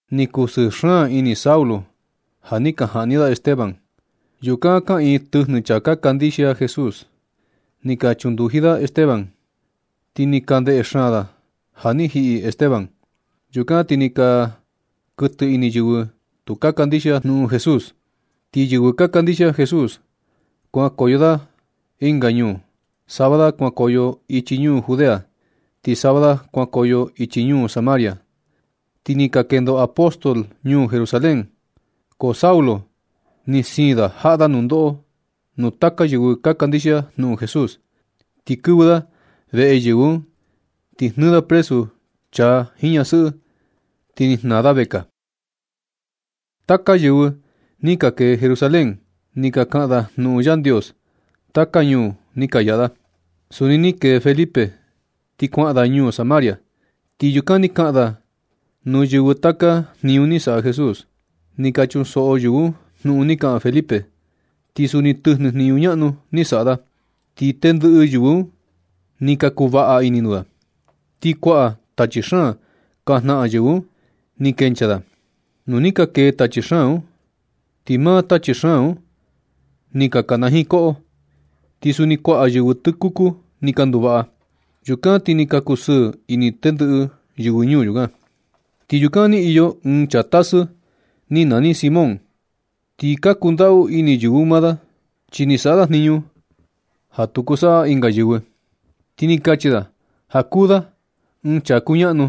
Ni kusɨɨ ini Saulo ja ni ka jaꞌni da Esteban. Yukan kaꞌiin tɨjnɨ chaa ka kandixia Jesús, ni ka chunduji da Esteban, ti ni ka ndeꞌe xaan da ja ni jiꞌi Esteban. Yukan ti ni ka kuɨtɨ ini yɨvɨ tu ka kandixia jnuꞌun Jesús, ti yɨvɨ ka kandixia Jesús kuankoyo da ɨnga ñuu. Sava da kuankoyo ichi ñuu Judea, ti sava da kuankoyo ichi ñuu Samaria, ti ni ka kendo apóstol ñuu Jerusalén. Ko Saulo ni siin da jaꞌa da nundoꞌo nuu taka yɨvɨ ka kandixia jnuꞌun Jesús. Ti kɨvɨ da veꞌe yɨvɨ un, ti ni jnɨɨ da presu chaa jiin ñasɨꞌɨ, ti ni jnaa da vekaa. Taka yɨvɨ ni ka kee Jerusalén, ni ka kaꞌan da jnuꞌun Yandios taka ñuu ni ka yaꞌa da. Suni ni kee Felipe ti kuaꞌan da ñuu Samaria, ti yukan ni kaꞌan da nuu yɨvɨ taka jniñu ni saꞌa Jesús. Ni ka chunsoꞌo yɨvɨ un jnuꞌun ni kaꞌan Felipe, ti suni tɨjnɨ jniñu ñaꞌnu ni saꞌa da. Ti tendɨꞌɨ yɨvɨ un ni ka kuvaꞌa ini nuu da. Ti kuaꞌa tachi xaan ka jnaꞌan yɨvɨ un ni kenchaa da. Nu ni ka kee tachi xaan un, ti maa tachi xaan un ni ka kanajiin koꞌo. Ti suni kuaꞌa yɨvɨ tɨkuku ni ka nduvaꞌa. Yukan ti ni ka kusɨɨ ini tendɨꞌɨ yɨvɨ ñuu yukan. Ti yukan ni iyo ɨɨn chaa tasɨ ni nani Simón. Ti ka kundaꞌu ini yɨvɨ un maa da, chi ni saꞌa da jniñu ja tu kuu saꞌa ɨnga yɨvɨ, ti ni kachi da ja kuu da ɨɨn chaa kuñaꞌnu.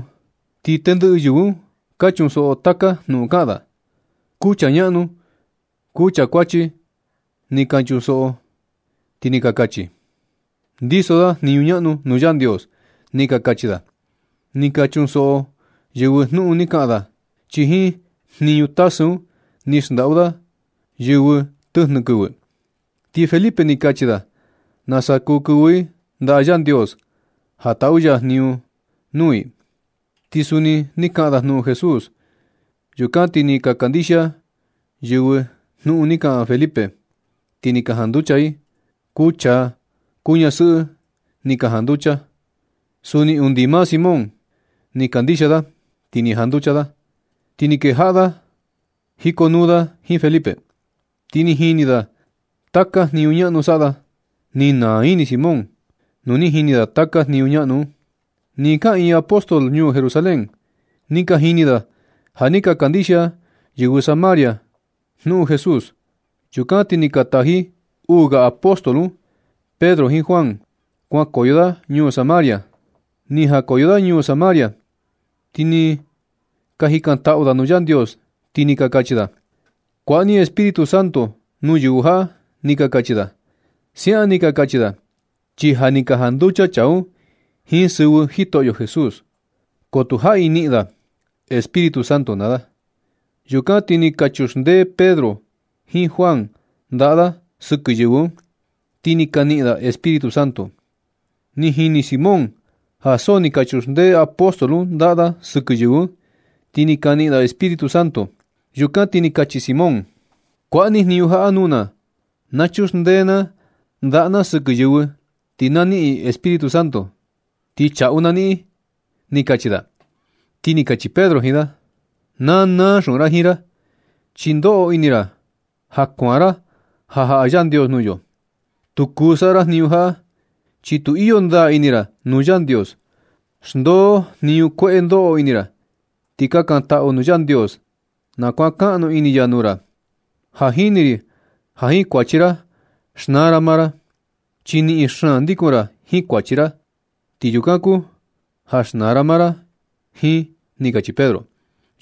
Ti tendɨꞌɨ yɨvɨ un ka chunsoꞌo taka jnuꞌun kaꞌan da. Kuu chaa ñaꞌnu kuu chaa kuachi ni ka chunsoꞌo ti ni ka kachi: ―Ndiso da jniñu ñaꞌnu nuu Yandios ―ni ka kachi da. Ni ka chunsoꞌo yɨvɨ jnuꞌun ni kaꞌan da, chi jiin jniñu tasɨ un ni xndaꞌu da yɨvɨ tɨjnɨ kɨvɨ. Ti Felipe ni kachi da nasa kuu kɨvɨ i ndaꞌa Yandios ja taꞌu ya jniñu nuu i. Ti suni ni kaꞌan da jnuꞌun Jesús. Yukan ti ni ka kandixia yɨvɨ jnuꞌun ni kaꞌan Felipe, ti ni ka janducha i. Kuu chaa, kuu ñasɨꞌɨ ni ka janducha. Suni undi maa Simón ni kandixia da, ti ni janducha da. Ti ni kejaꞌa da jikonuu da jiin Felipe, ti ni jini da taka jniñu ñaꞌnu saꞌa da. Ni naa ini Simón nu ni jini da taka jniñu ñaꞌnu un. Nɨ kaꞌiin apóstol ñuu Jerusalén, ni ka jini da ja ni ka kandixia yɨvɨ Samaria jnuꞌun Jesús. Yukan ti ni ka taji uu ga apóstol un Pedro jiin Juan kuankoyo da ñuu Samaria. Ni jakoyo da ñuu Samaria, ti ni ka jikantaꞌu da nuu Yandios, ti ni ka kachi da: ―Kuaꞌa ni Espíritu Santo nuu yɨvɨ jaꞌa ―ni ka kachi da. Siaꞌan ni ka kachi da, chi ja ni ka janducha chaa un jiin sɨvɨ Jitoꞌyo Jesús, ko tu jaꞌi niꞌin da Espíritu Santo naa da. Yukan ti ni ka chuxndee Pedro jiin Juan ndaꞌa da sɨkɨ yɨvɨ un, ti ni ka niꞌin da Espíritu Santo. Ni jini Simón ja so ni ka chuxndee apóstol un ndaꞌa da sɨkɨ yɨvɨ un, ti ni ka niꞌin i Espíritu Santo. Yukan ti ni kachi Simón: ―Kuaꞌa ni jniñu jaꞌa nuu na, na chuxndee na ndaꞌa na sɨkɨ yɨvɨ, ti na niꞌin i Espíritu Santo, ti chaꞌu na niꞌin ―ni kachi da. Ti ni kachi Pedro jiin da: ―Na naa xuꞌun ra jiin ra, chi ndoꞌo ini ra ja kuan ra ja jaꞌa Yandios nuu yo. Tu kuu saꞌa ra jniñu jaꞌa, chi tu iyo ndaa ini ra nuu Yandios. Xndoo jniñu kueꞌe ndoꞌo ini ra, ti kakantaꞌu nuu Yandios na kuankaꞌnu ini ya nuu ra. Ja jini ri ja jiin kuachi ra xnaa ra maa ra, chi niꞌin xaan ndikun ra jiin kuachi ra. Ti yukan kuu ja xnaa ra maa ra jiin ―ni kachi Pedro.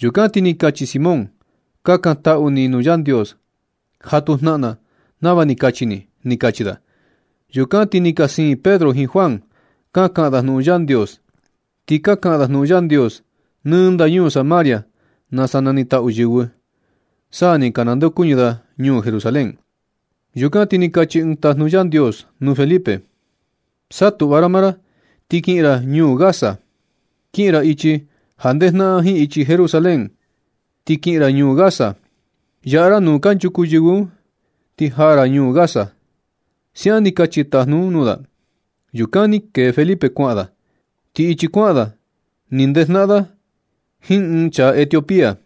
Yukan ti ni kachi Simón: ―Kakantaꞌu ni nuu Yandios ja tu jnaꞌan na nava ni kachi ni ―ni kachi da. Yukan ti ni ka siin Pedro jiin Juan ka kaꞌan da jnuꞌun Yandios. Ti ka kaꞌan da jnuꞌun Yandios nɨ ndañuu Samaria nasa nanitaꞌu yɨvɨ. Sa ni ka nandeokuñɨ da ñuu Jerusalén. Yukan ti ni kachi ɨɨn tajnu Yandios nuu Felipe: ―Saꞌa tuꞌva ra maa ra ti kiꞌin ra ñuu Gaza. Kiꞌin ra ichi ja ndejnaꞌan jiin ichi Jerusalén, ti kiꞌin ra ñuu Gaza. Yaꞌa ra nu tu kanchuku yɨvɨ un, ti jaa ra ñuu Gaza. Siaꞌan ni kachi tajnu un nuu da. Yukan ti ni kee Felipe kuaꞌan da. Ti ichi kuaꞌan da ni ndejnaꞌan da jiin ɨɨn chaa Etiopía.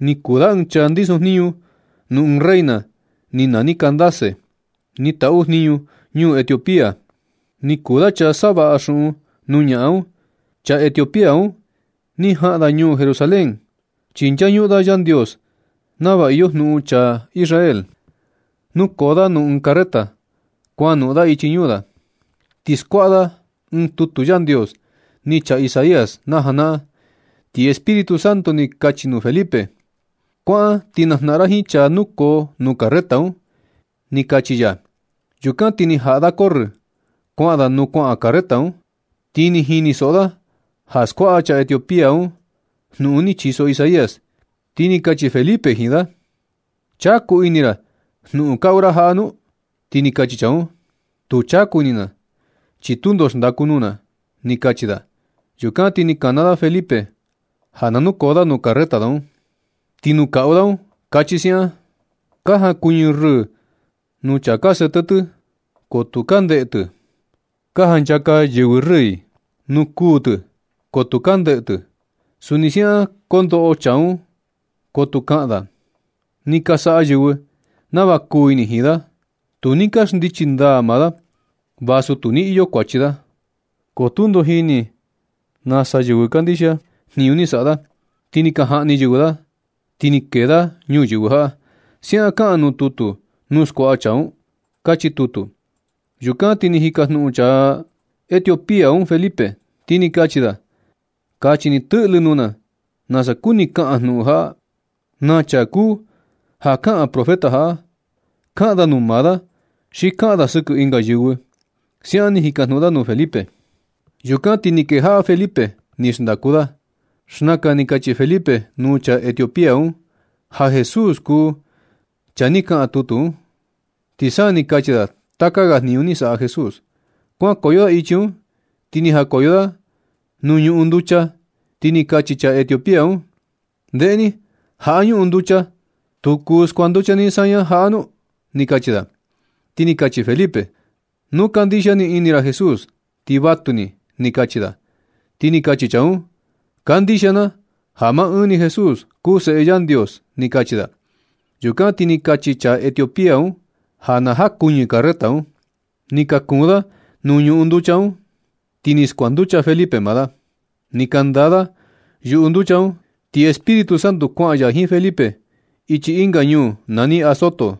Ni kuu da ɨɨn chaa ndisojniñu nuu ɨɨn reina ni nani Candace, ni taꞌu jniñu ñuu Etiopía. Ni kuu da chaa savaꞌa xuꞌun nuu ñaꞌan un. Chaa Etiopía un ni jaꞌan da ñuu Jerusalén, chi nchañuꞌun da Yandios nava iyo jnuꞌun chaa Israel. Nukoo da nuu ɨɨn carreta kuanoꞌon da ichi ñuu da. Ti skuaꞌa da ɨɨn tutu Yandios ni chaa Isaías najanaꞌan. Ti Espíritu Santo ni kachi nuu Felipe: ―Kuaꞌan ti najnaꞌan ra jiin chaa nukoo nuu carreta un ―ni kachi ya. Yukan ti ni jaꞌa da corrɨ kuaꞌan da nuu kuaꞌan carreta un, ti ni jinisoꞌo da ja skuaꞌa chaa Etiopía un jnuꞌun ni chiso Isaías, ti ni kachi Felipe jiin da: ―¿Chaku ini ra jnuꞌun kaꞌu ra jaꞌa nu? Ti ni kachi chaa un: ―Tu chaku ini na, chi tundo xndaku nuu na ―ni kachi da. Yukan ti ni kana da Felipe ja na nukoo da nuu carreta da un. Ti nuu kaꞌu da un kachi siaꞌan: Ka jankuñɨ rɨɨ nuu chaa ka sete tɨ, ko tu ka ndeꞌe tɨ. Ka janchaka yɨvɨ rɨɨ i nuu kuu tɨ, ko tu ka ndeꞌe tɨ. Suni siaꞌan kondoꞌo chaa un, ko tu kaꞌan da. Ni ka saꞌa yɨvɨ nava kuu ini jiin da. Tu ni ka xndichi ndaa maa da, vasu tu ni iyo kuachi da. Ko tundo jini nasa yɨvɨ kandixia jniñu ni saꞌa da. Ni ka jaꞌni yɨvɨ da, ti ni kee da ñuyɨvɨ jaꞌa. Siaꞌan kaꞌan nuu tutu nuu skuaꞌa chaa un. Kachi tutu. Yukan ti ni jikajnuꞌun chaa Etiopía un Felipe, ti ni kachi da: ―Kachi ni tɨꞌlɨ nuu na nasa kuni kaꞌan jnuꞌun jaꞌa. Na chaa kuu ja kaꞌan profeta jaꞌa. Kaꞌan da nu maa da, xi kaꞌan da sɨkɨ ɨnga yɨvɨ ―siaꞌan ni jikajnuꞌun da nuu Felipe. Yukan ti ni kejaꞌa Felipe ni xndaku da. Xnaka ni kachi Felipe nuu chaa Etiopía un ja Jesús kuu chaa ni kaꞌan tutu un, ti sa ni kachi da taka ga jniñu ni saꞌa Jesús. Kuankoyo da ichi un, ti ni jakoyo da nuu ñuꞌun nducha, ti ni kachi chaa Etiopía un: ―Ndeꞌe ni. Jaꞌa ñuꞌun nducha ¿tu kuu skuanducha ni saña jaꞌa nu? ―ni kachi da. Ti ni kachi Felipe: ―Nu kandixia nɨ ini ra Jesús, ti vatuni ―ni kachi da. Ti ni kachi chaa un: ―Kandixia na ja maa ɨɨn Jesús kuu Seꞌe Yandios ―ni kachi da. Yukan ti ni kachi chaa Etiopía un ja na jakuɨñɨ carreta un. Ni ka kuun da nuu ñuꞌun nducha un, ti ni skuanducha Felipe maa da. Ni ka ndaa da yuꞌu nducha un, ti Espíritu Santo kuaꞌan ya jiin Felipe ichi ɨnga ñuu nani Azoto.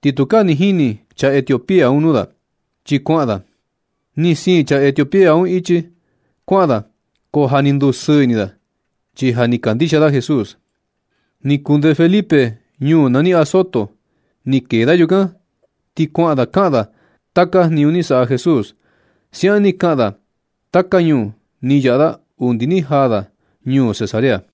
Ti tukaa ni jini chaa Etiopía un nuu da, chi kuaꞌan da. Ni siin chaa Etiopía un ichi kuaꞌan da, ko ja ni ndusɨɨ ini da, chi ja ni kandixia da Jesús. Ni kunde Felipe ñuu nani Azoto. Ni kee da yukan, ti kuaꞌan da kaꞌan da taka jniñu ni saꞌa Jesús. Siaꞌan ni kaꞌan da taka ñuu ni yaꞌa da undi ni jaa da ñuu Cesarea.